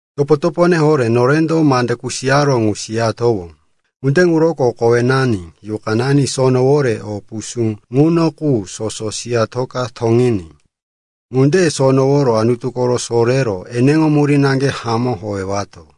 Topo-topone horé, norendo mande kusiyaró ŋu siyatowó. Ŋunde ŋuroko kowenani, yuqanani sonoworo o pusú ŋuno qu soso siyatoka toŋiní. Ŋunde sonoworo Anutu koro sorero eneŋo murí naŋge hamó howewato.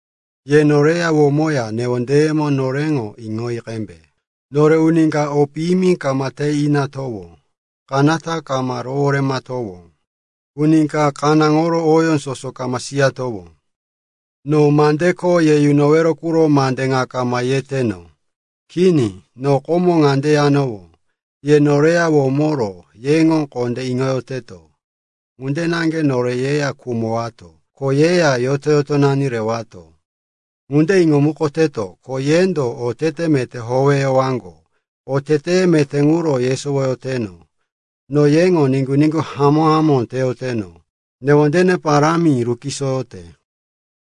Ye noreya womoya newondeyemo noreŋo iŋoyi qembe. Nore uni ka o piyimi kama te inatowó, kanata kama roworematowó. Uni ka kanáŋoro oyó soso kama siyatowó. No mande kho ye yunowero quro mande ŋa kama yeteno. Kini, no komo ŋande yanowó, ye noreya womoro yeŋo kondé iŋoyoteto. Ŋunde naŋge nore yeya khumowato, ko yeya yoto-yotonani rewato. Ŋande iŋomukoteno, ko yendo otete meté howeyowaŋgo, oteteye meté ŋuro yesowoyoteno. No yeŋo niŋgu-niŋgu hamó-hamó teyoteno, newondene parámi rukisoyote.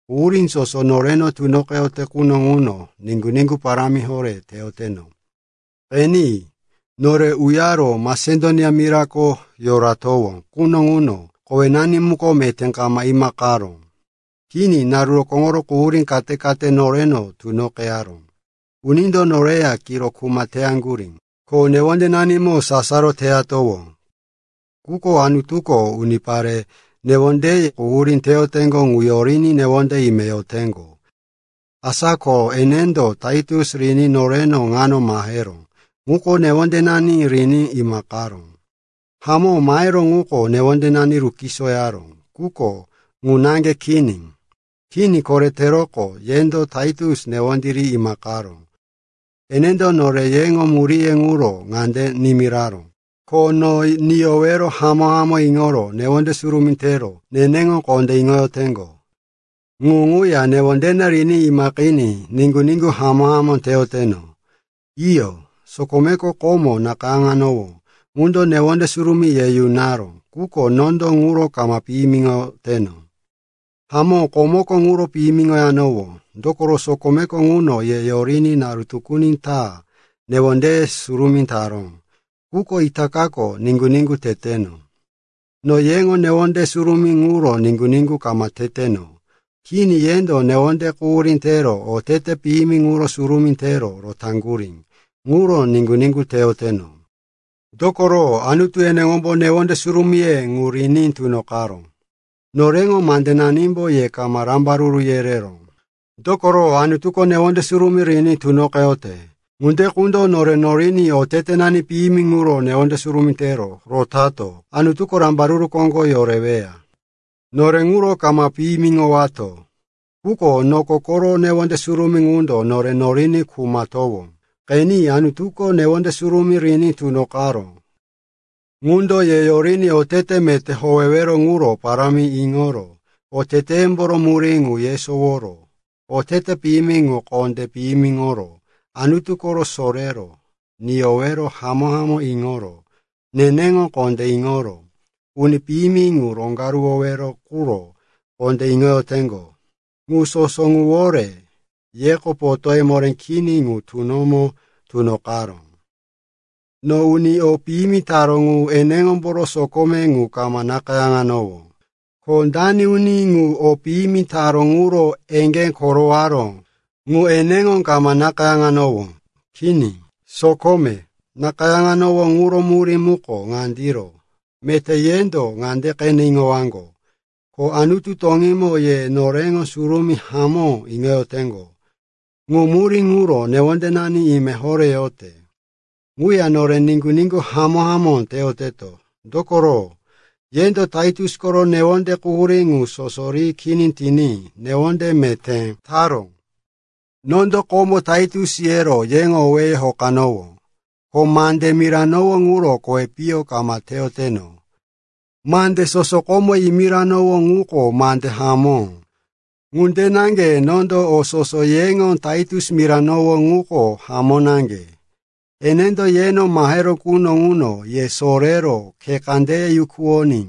Quhurí soso noreno tunoqeyote quno ŋuno niŋgu-niŋgu parámi horé teyoteno. Qeni, nore uyaro Masedonia mirako yoratowó quno ŋuno kowenani muko meté kama imaqeyaró. Kini, naru rokóŋoro quhurí kate-kate noreno tunoqeyaró. Unindo noreya kiro kuma teyaŋgurí, ko newondenanimo sasaro teyatowó. Quko Anutuko unipare newonde quhurí teyoteŋgo ŋu yoriní newonde ime yoteŋgo. Asa ko enendo Taitus riní noreno ŋano maheró ŋuko newondenani riní imaqaró. Hamó, maheró ŋuko newondenani rukisoyaró, quko ŋu naŋge kini. Kini, koreteroqo yendo Taitus newondí ri imaqaró. Enendo nore yeŋo muríye ŋuro ŋande nimiraró, ko no niyowero hamó-hamó iŋoro newonde surumí tero neneŋo kondé iŋoyoteŋgo. Ŋu ŋuya newondene riní imaqiní niŋgu-niŋgu hamó-hamó teyoteno. Iyo, sokome komo nakayáŋanowó ŋundo newonde surumí ye yunaró, quko nondo ŋuro kama piyimiŋoteno. Hamó, komoko ŋuro piyimiŋoyanowó, dokoro sokome ŋundo ye yoriní naru tukuni ta newondeye surumí taró. Quko itakako niŋgu-niŋgu teteno. No yeŋo newonde surumíye ŋuro niŋgu-niŋgu kama teteno. Kini, yendo newonde quhurí tero oteteye piyimi ŋuro surumí tero rotaŋgurí. Ŋuro niŋgu-niŋgu teyoteno. Dokoro Anutu eneŋombo newonde surumíye ŋu riní tunoqaró. Noreŋo mandenanimbo ye kama rambaruru yereró. Dokoro Anutuko newonde surumí riní tunoqeyote ŋunde qundo nore noriní otetenani piyimi ŋuro newonde surumí tero rotato Anutuko rambaruru koŋgo yoreweya. Nore ŋuro kama piyimiŋowato. Quko noko koro newonde surumí ŋundo nore noriní khumowato. Qeni, Anutuko newonde surumí riní tunoqaró ŋundo ye yoriní otete meté howewero ŋuro parámi iŋoro, oteteyemboro murí ŋu yesoworo, otete piyimi ŋu kondé piyimiŋoro, Anutu koro sorero, niyowero hamó-hamó iŋoro, neneŋo kondé iŋoro, uni piyimi ŋu roŋgaruwowero quro kondé iŋoyoteŋgo. Ŋu soso ŋuwore yeko potóye moré kini ŋu tunomo tunoqaró. No uni o piyimi taró ŋu eneŋomboro sokome ŋu kama nakayáŋanowó, ko dani uni ŋu o piyimi taró ŋuro eŋgé korowaró ŋu eneŋo kama nakayáŋanowó. Kini, sokome nakayáŋanowó ŋuro murí muko ŋandiro, meté yendo ŋande qene iŋowaŋgo, ko Anutu toŋímo ye noreŋo surumí hamó iŋoyoteŋgo. Ŋu murí ŋuro newondenani ime horé yote. Ŋuya nore niŋgu-niŋgu hamó-hamó teyoteto, dokoro yendo Taitus koro newonde quhurí ŋu soso ri kini tiní newondí meté taró. Nondo komo Taitus yero yeŋo owéye hokanowó, ko mande miranowó ŋuro kowi piyo kama teyoteno. Mande soso komo yimiranowó ŋuko mande hamó. Ŋunde naŋge nondo o soso yeŋo Taitus miranowó ŋuko hamó naŋge. Enendo yeno maheró quno ŋuno ye sorero khe kandeye yukuwoní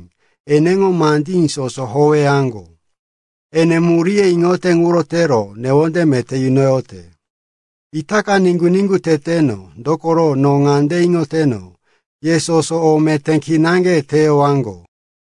eneŋo mandí soso howeyaŋgo. Ene muríye iŋote ŋuro tero newonde meté yunoyote. Itaka niŋgu-niŋgu teteno, dokoro no ŋande iŋoteno, ye soso o meté kinaŋge teyowaŋgo.